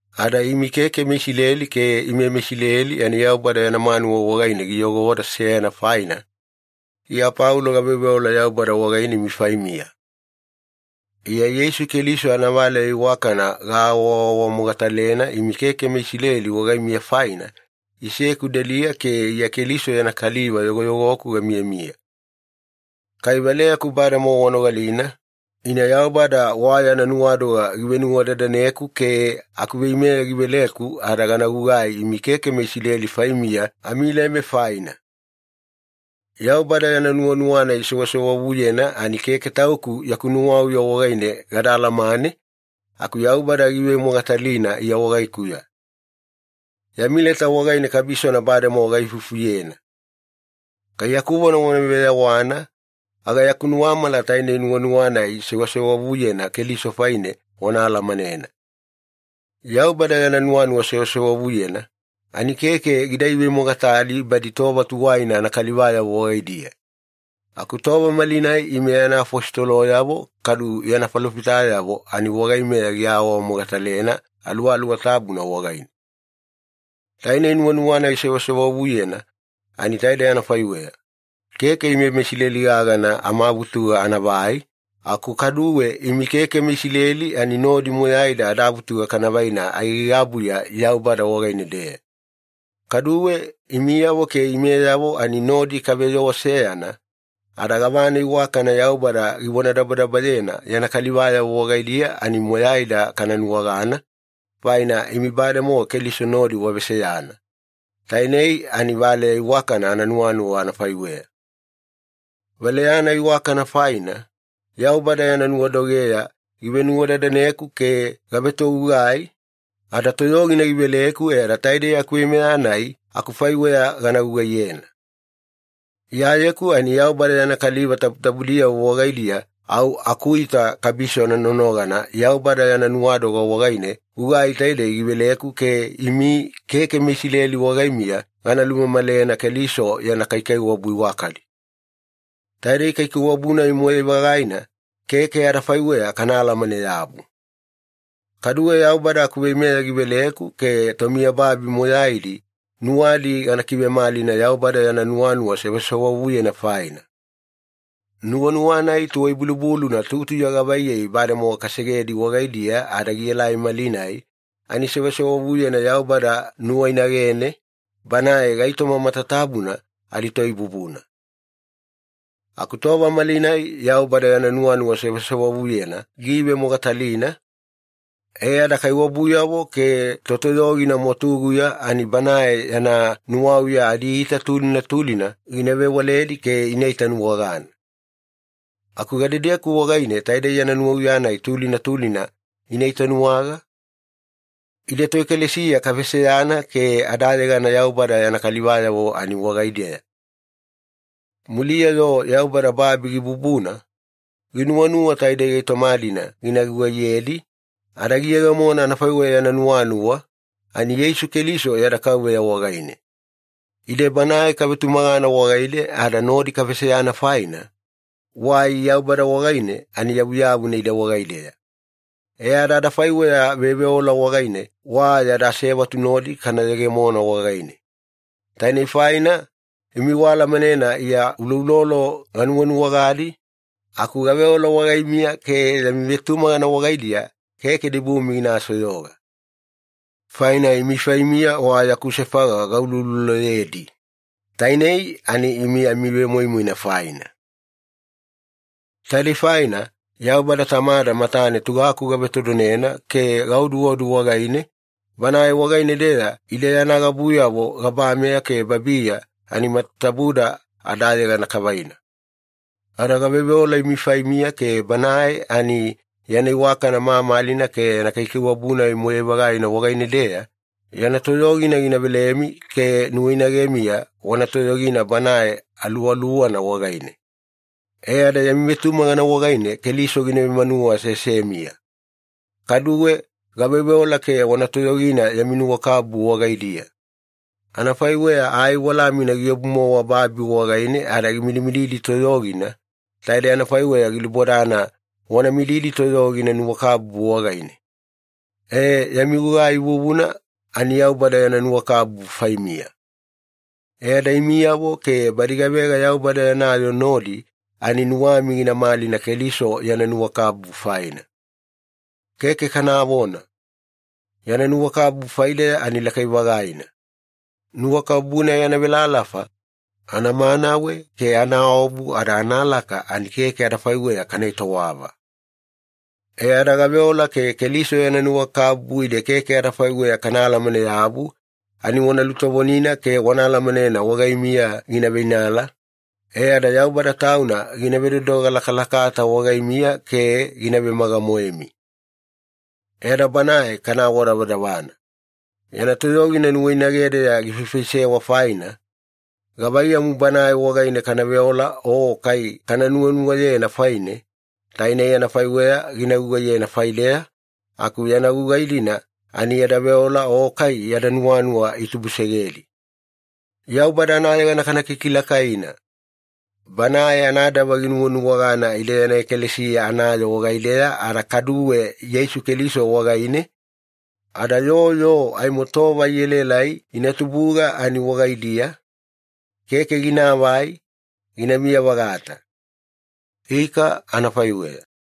Ada imi keke meIsileli ke ime meIsileli ani Yaubada yana manuwa wagaine giyogoda seyana faina, Iya Paulo gaveoveola Yaubada wagaine imi faimiya. Iya Yeisu Keliso anavaleya iwakana gaawaawamogatalena imi keke meIsileli wagaimiya faina, iseku deliya ke Iya Keliso yana kaliva yogoyogoku gamiyamiya. Kai valeyaku bademowa wanogalina, ina Yaubada wa yana nuwadoga givenuwadadaneku ke akuveimeya giveleku ada gana gugai imi keke meIsileli faimiya amileme faina. Yaubada yana nuwanuwa-nai sewasewavuyena ani keke tauku yaku nuwauya wagaine gada alamane, aku Yaubada giivemogatalina Iya wagaikuya. Yami leta wagaine kabisona bademowa gaifufuyena. Kai yaku vona wana veyawana, aga yaku nuwamala tainei nuwanuwa-nai sewasewavuyena Keliso faine wana alamanena. Yaubada yana nuwanuwa sewasewavuyena ani keke gida ivemogatali badi tova tuwaina anakalivayavo wagaidiya. Aku tova malinai ime yana afositoloyavo kadu yana falofitayavo ani wagaimeya giawamogatalena Aluwaluwa Tabuna wagaine. Tainei nuwanuwa-nai sewasewavuyena ani taidei anafaiweya. Keke ime meIsileli gagana amavutuga anavai, aku kaduwe imi keke meIsileli ani nodi moyaida adavutuga kana vaina aigaigabuya Yaubada wagaine-deya. Kaduwe, imiyavo ke imeyavo ani nodi kaveyoo seyana, ada gavana iwakana Yaubada givonadabadabayena yana kalivayavo wagaidiya ani moyaida kana nuwagana, faina imi bademowa Keliso nodi waveseyana. Tainei ani valeya iwakana ananuwanuwa anafaiweya. Valeya-nai iwakana faina, Yaubada yana nuwadogeya givenuwadadaneku ke gavetogugai, ada toyogina giveleku e ada taidei akuveimeya-nai akufaiweya gana gugaiyena. Iyayeku ani Yaubada yana kaliva tabutabudiyavo wagaidiya au akuita kabisona nonogana Yaubada yana nuwadoga wagaine gugai taidei giveleku ke imi keke meIsileli wagaimiya gana lulumamalena Keliso yana kaikaiwabu iwakadi. Taidei kaikaiwabu-nai moyai-vagaina, keke adafaiweya kana alamane-yabu. Kaduwe Yaubada akuveimeya giveleku ke tomiyababi moyaidi nuwadi gana kivemalina Yaubada yana nuwanuwa sewasewavuyena faina. Nuwanuwa-nai tuwai-bulubuluna tutuya gavaiyei bademowa kasegedi wagaidiya ada gielai malinai ani sewasewavuyena Yaubada nuwainagene, Banae gaitoma matatabuna adiToibubuna. Aku tova malinai Yaubada yana nuwanuwa sewasewavuyena giivemogatalina, e ada kaiwabuyavo ke totoyogina mwatuguya ani Banae yana nuwauya adiita tulina tulina gina vewaledi ke ina itanuwagana. Aku gadedeku wagaine taidei yana nuwauya-nai tulina tulina ina itanuwaga? Ide toekalesiya kaveseyana ke adayegana Yaubada yana kalivayavo ani wagaideya. Muliya-yo Yaubada babi gibubuna, ginuwanuwa taidei gaitoma-dina gina gugaiyedi, ada giyegemona anafaiweya yana nuwanuwa, ani Yeisu Keliso yada Kauveya wagaine. Ide Banae kavetumagana wagaine ada nodi kaveseyana faina, wai Yaubada wagaine ani yavuyavuna ide wagaideya. E ada adafaiweya veoveola wagaine wa yada asevatu nodi kana yegemona wagaine. Tainei faina, imi waalamanena Iya uloulolo ganuwanuwagadi, aku gaveola wagaimiya ke yami vetumagana wagaidiya keke dibumi gina soyoga. Faina imi faimiya wa yaku sefaga gaulouloloyedi, tainei ani imi amivemoimoina faina. Taidei faina, Yaubada Tamada matane tugaku gavetodonena ke gaoduodu wagaine, Banae wagaine-deya ide yana gabuyavo gabameya ke babiya ani matatabuda adayegana kavaina. Ada gaveoveola imi faimiya ke Banae ani yana iwakana mamalina ke yana kaikaiwabu-nai moyai-vagaina wagaine-deya, yana toyogina gina velemi ke nuwainagemiya wana toyogina Banae Aluwaluwana wagaine. E ada yami vetumagana wagaine Keliso gina vemanuwa aseasemiya. Kaduwe gaveoveola ke wana toyogina yami nuwakabubu wagaidiya. Anafaiweya ai walamina giobu-mowa babi wagaine ada gimidimididi toyogina, taidei anafaiweya gilubodana wana midimididi toyogina nuwakabubu wagaine. E, yami gugai vuvuna ani Yaubada yana nuwakabubu faimiya. E ada imiyavo ke badi gavega Yaubada yana yoo nodi ani nuwami gina malina Keliso yana nuwakabubu faina. Keke kanavona! Yana nuwakabubu faideya ani lakai-vagaina. Nuwakabubu-nai anavelalafa, anavemanawe ke anaobu ada analaka ani keke adafaiweya kana etowava. E ada gaveola ke Keliso yana nuwakabubu ide keke adafaiweya kana alamane-yabu ani wana lutovonina ke anaalamana wagaimiya gina veinala, e ada Yaubada Tauna gina vedodoga lakalakata wagaimiya ke gina vemaga-moemi. E ada Banae kana awadavadavana. Yana toyogina nuwainagedeya gifaifaisewa faina, gavaiyamu Banae wagaine kana veola o kai kana nuwanuwayena faine, tainei anafaiweya gina gugaiyena faideya, aku yana gugai-dina ani yada veola o kai yada nuwanuwa itubusegedi. Yaubada anayegana kana kikilakaina! Banae anadava ginuwanuwagana ide yana ekalesiya anayoo wagaideya ada kaduwe Yeisu Keliso wagaine, ada yoo yoo aimo tova ielaelai ina tubuga ani wagaidiya, keke ginaavai, ginamiya-vagata. Ika anafaiweya.